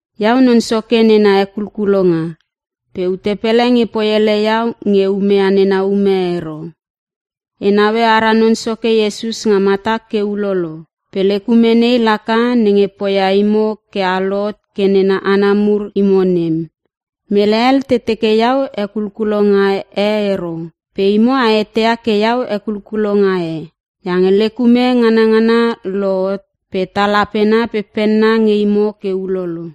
Iau Non Soke nena hekulkulonga, pe ute pele nge poiele iau nge e umeia nena ume ero. E naue ara Non Soke Iesus nga matak ke ulolo? Pe lek ume nei laka nenge poia imo ke a lohot ke nena hana mur imo nem. Mele hel te teke iau hekulkulonga e ero pe imo a eteia ke iau hekulkulonga e, iange lek ume nganangana lohot pe tal apena pe penna nge imo ke ulolo.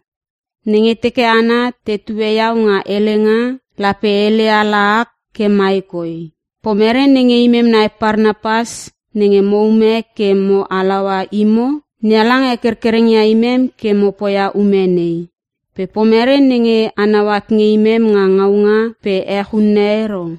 Nenge teke hana tetue iau nga helenga lape e hele ala ak ke mai koi, Pomerei nge imem nai Parnapas nenge moume ke mo halaua imo? NeHalang hekerkereng ia imem ke mo poia ume nei, pe pomerei nenge a nau at nge imem nga ngaunga pe ech unne ero?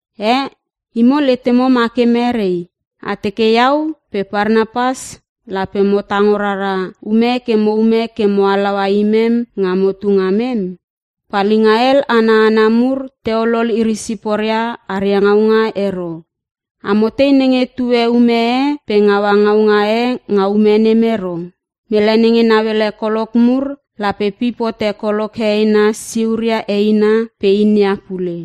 Eh, imo letemo ma ke merei? A teke iau pe Parnapas lape mo tango rara ume ke moume ke mo halaua imem nga motu ngamem? Palinga hel ana hana mur te olol iri siporia aria ngaunga ero. Amo tei nenge tue ume e pe ngaua ngaunga e nga ume nem ero? Mele nenge nauele kolok mur lape pip hote kolok heheina siuria eina pe inia pule.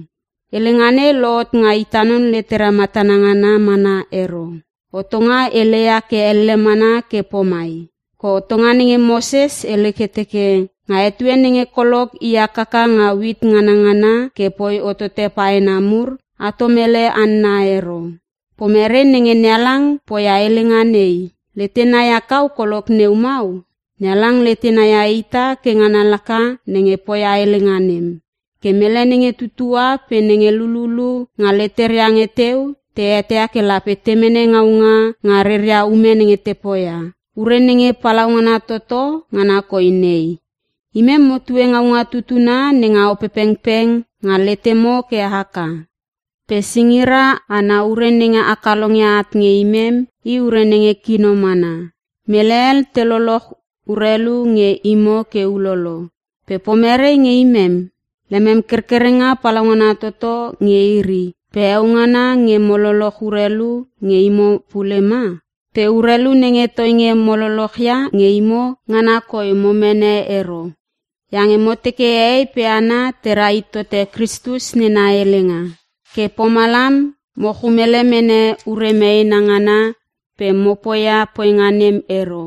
Helenga nei lohot nga ita non letera matana ngana mana ero. Hotonga heleia ke elle mana ke pomai. Ke Hotonga nenge Moses hele ke teke; “Nga etue nenge kolok i hakaka nga uit nganangana ke poi hotote paena mur, atom ele hanna ero.” Pomerei nenge NeHalang poia helenga nei, letena ia kau kolok neu mau? NeHalang letena ia ita ke ngana laka nenge poia helenga nem. Ke mele nenge tutua pe nenge lululu, nga leteria nge teu te eteia ke lape te mene ngaunga nga reria ume nenge te poia. Ure nenge palaungana toto ngana koi nei; Imem motue ngaunga tutuna nenga Opepengpeng nga letemo ke haka. Pe singira ana ure nenge a kalongia at nge imem i ure nenge kino mana. Mele hel te loloch urelu nge imo ke ulolo pe pomerei nge imem? Lemem kerkerenga palaungana toto nge iri pe heo ngana nge mo loloch urelu nge imo pule ma? Pe urelu nenge toinge mo lolochia nge imo ngana koi mo mene ero. Iange mo teke hehei pe hana tera hit tote Kristus nena helenga. Ke pomalam mo chumele mene ure meena ngana pe mopoia poinga nem ero.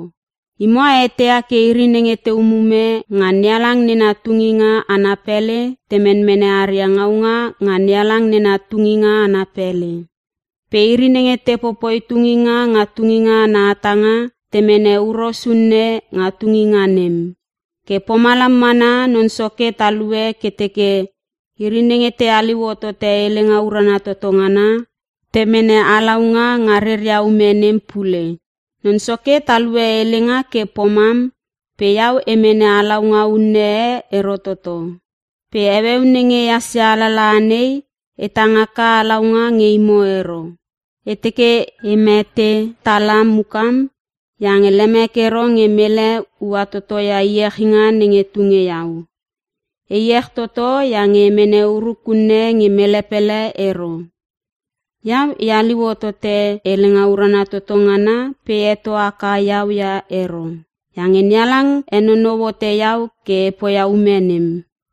Imo a eteia ke iri nenge te umume nga NeHalang nena tunginga ana pele te menmene aria ngaunga nga NeHalang nena tunginga ana pele. Pe iri nenge te popoi tunginga nga tunginga ana hatanga te mene huros unne nga tunginga nem. Ke pomalam mana Non Soke talue ke teke iri nenge te haliu hotote helenga urana toto ngana, te mene halaunga nga reria ume nem pule. Non Soke talue helenga ke pomam pe iau e mene halaunga unne e ero toto. Pe heueu nenge ehas ia alalaha nei, e tang haka halaunga nge imo ero. E teke e mete tala mukam iange lemek ero nge mele ua toto ia iechinga nenge tunge iau. E iech toto iange e mene uruk unne nge mele pele ero. Iau e haliu hotote helenga urana toto ngana pe e heto haka iau ia ero. Iange NeHalang henonou hote iau ke e poia ume nem,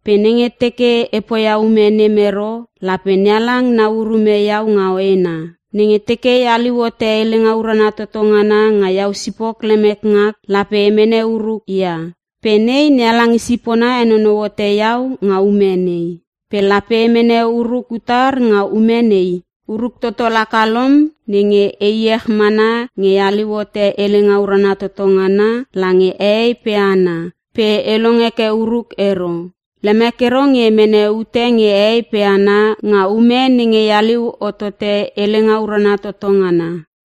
pe nenge teke e poia ume nem ero lape NeHalang nau urume iau nga hoena. Nenge teke e haliu hote helenga urana toto ngana nga iau sipok lemek ngak lape e mene uruk ia. Pe nei NeHalang i sipona henonou hote iau nga ume nei. Pe lape e mene uruk utar nga ume nei? Uruk toto laka lom nenge; E iech mana nge e haliu hote helenga urana toto ngana lange hehei pe hana pe e long heke uruk ero. Lemek ero nge e mene ute nge hehei pe hana nga ume nenge e haliu hotote helenga urana toto ngana.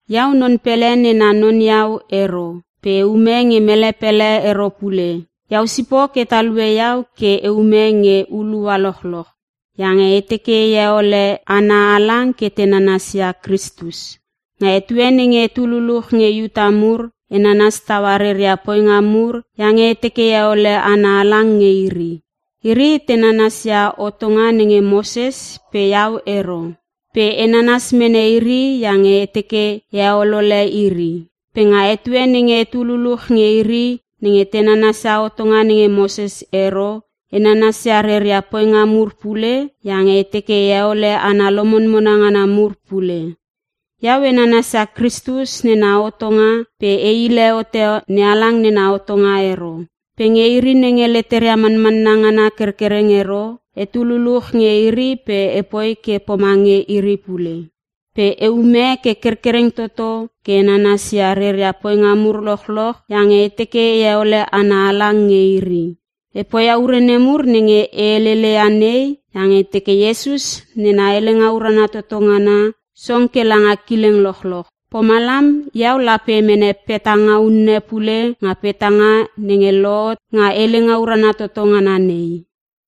Iau non pele nena non iau ero pe eume nge mele pele ero pule. Iau sipok e talue iau ke eume nge hulua lochloch. Iange e teke e heole hana halang ke te nanasia Kristus. Nga etue nenge etu luluch nge Iuta mur e nanas taua reria poinga mur iange e teke e heole hana halang nge iri. Iri te nanasia hotonga nenge Moses pe iau ero. Pe e nanas mene iri iange e teke e heolole iri. Pe nga etue nenge etu luluch nge iri nenge te nanasia hotonga nenge Moses ero, e nanasia reria poinga mur pule iange e teke e heole hana lomonmona ngana mur pule. Iau e nanasia Kristus nena hotonga pe e hile hote NeHalang nena hotonga ero. Pe nge iri nenge leteria manmanna ngana kerkereng ero, etu luluch nge iri pe epoi ke pomange iri pule. Pe eume ke kerkereng toto ke e nanasia reria poinga mur lochloch iange e teke e heole hana halang nge iri. E poia ure nemur nenge e helele ia nei iange e teke Iesus nena helenga urana toto ngana song ke langa kileng lochlolch. Pomalam iau lape e mene petanga unne pule nga petanga nenge lohot nga helenga urana toto ngana nei.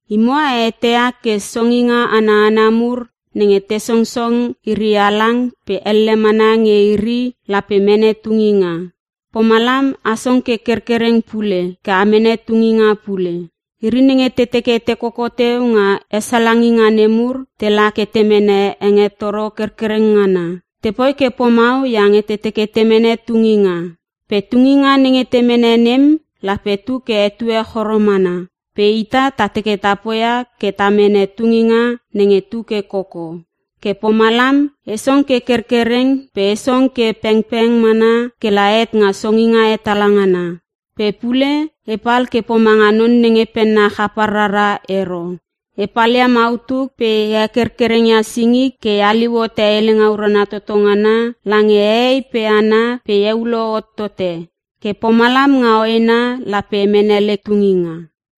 Imo a eteia ke songinga ana hana mur nenge te songsong iri halang pe elle mana nge iri lape mene tunginga. Pomalam a song ke kerkereng pule ke a mene tunginga pule. Iri nenge te teke te koko teu nga hesalanginga nemur tela ke te mene hengetoro kerkereng ngana. Tepoi ke pomau iange te teke te mene tunginga. Pe tunginga nenge te mene nem lape tu ke etue choro mana pe ita ta teke ta poia ke ta mene tunginga nenge tu ke koko. Ke pomalam e song ke kerkereng pe e song ke pengpeng mana kela het nga songinga hetala ngana. Pe pule epal ke pomanga non nenge penna chapar rara ero. E palia mautuk pe e hekerkereng ia singik ke e haliu hote helenga urana toto ngana lange hehei pe hana pe e eulo hot tote. Ke pomalam nga hoena lape e mene lek tunginga.